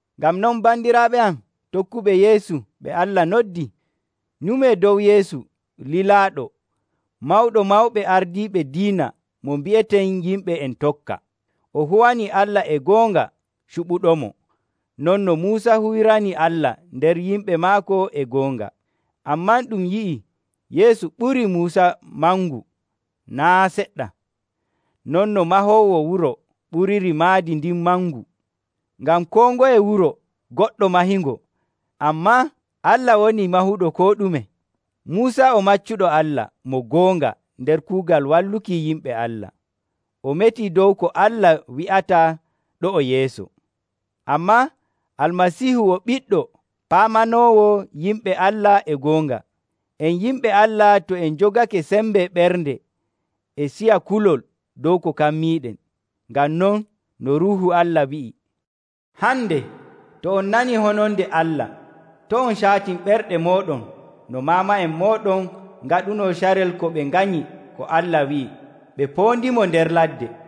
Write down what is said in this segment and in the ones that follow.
Ngam non, bandiraaɓe am tokkuɓe Yeesu ɓe Allah noddi, nyumee dow Yeesu, lilaaɗo, Mawɗo Mawɓe Ardiiɓe Diina mo mbi'eten yimɓe en tokka. O huwani Allah e goonga cuɓuɗomo, non no Muusa huwirani Allah nder yimɓe maako e goonga. Ammaa ɗum yi'ii Yeesu ɓurii Muusa mangu naa' seɗɗa, non no mahoowo wuro ɓuriri maadi ndin mangu. Ngam koo ngoye wuro goɗɗo mahingo, ammaa Allah woni mahuɗo koo ɗume. Muusa o maccuɗo Allah mo goonga nder kuugal walluki yimɓe Allah, o metii dow ko Allah wi'ata ɗo'o yeeso. Ammaa Almasiihu o ɓiɗɗo, paamanoowo yimɓe Allah e goonga. En yimɓe Allah to en njogake sembe ɓernde e ciya kulol dow ko kammiiɗen. Ngam non, no Ruuhu Allah wi'i, “Hande, to on nanii hononde Allah, to' on caatin ɓerɗe mooɗon no maama'en mooɗon ngaɗunoo carel ko ɓe nganyi ko Allah wi'i ɓe poondimo nder ladde.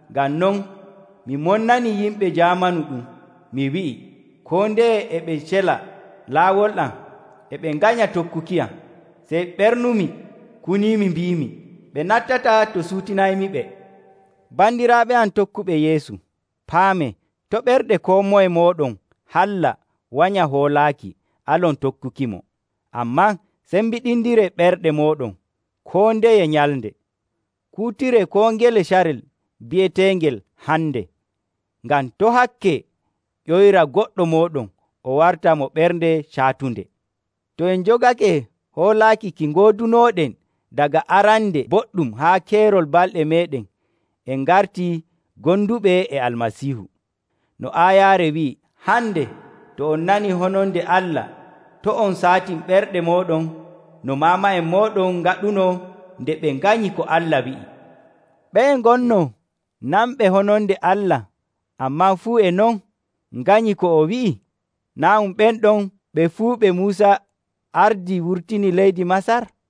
Ngam non, mi monnanii yimɓe jaamanu ɗum, mi wi'i, ‘Koo ndeye e ɓe cela laawol am, e ɓe nganya tokkukiyam.’ Sey ɓernumi kuniimi mbiimi, ‘Ɓe nattataa to ciwtinaymiɓe!’” Bandiraaɓe am tokkuɓe Yeesu, paamee to' ɓernde koo moye mooɗon halla wanya hoolaaki, alon tokkukimo. Ammaa cembiɗindiree ɓerɗe mooɗon koo ndeye nyalnde, kuutiree koo ngele carel bi'eteengel “Hande,” ngam to' hakke ƴoyra goɗɗo mooɗon o warta mo ɓernde caatunde. To en njogake hoolaaki ki ngoodunooɗen daga arande boɗɗum haa keerol balɗe meeɗen, en ngarti gonduɓe e Almasiihu. No aayaare wi'i, “Hande, to on nanii hononde Allah, to' on caatin ɓerɗe mooɗon no maama'en mooɗon ngaɗunoo nde ɓe nganyi ko Allah wi'i.” Ɓeye ngonnoo nanɓe hononde Allah, ammaa fuu e non nganyi ko o wi'i? Naa' ɗum ɓen ɗon ɓe fuu ɓe Muusa ardii wurtini leydi Masar?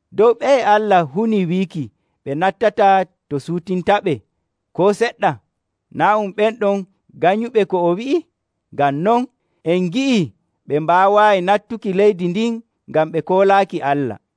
Dow ɓeye Allah hunii wiiki ɓe nattataa to ciwtintaɓe koo seɗɗa? Naa' ɗum ɓen ɗon ganyuɓe ko o wi'i? Ngam non, en ngi'ii ɓe mbaawaayi nattuki leydi ndin ngam ɓe koolaaki Allah.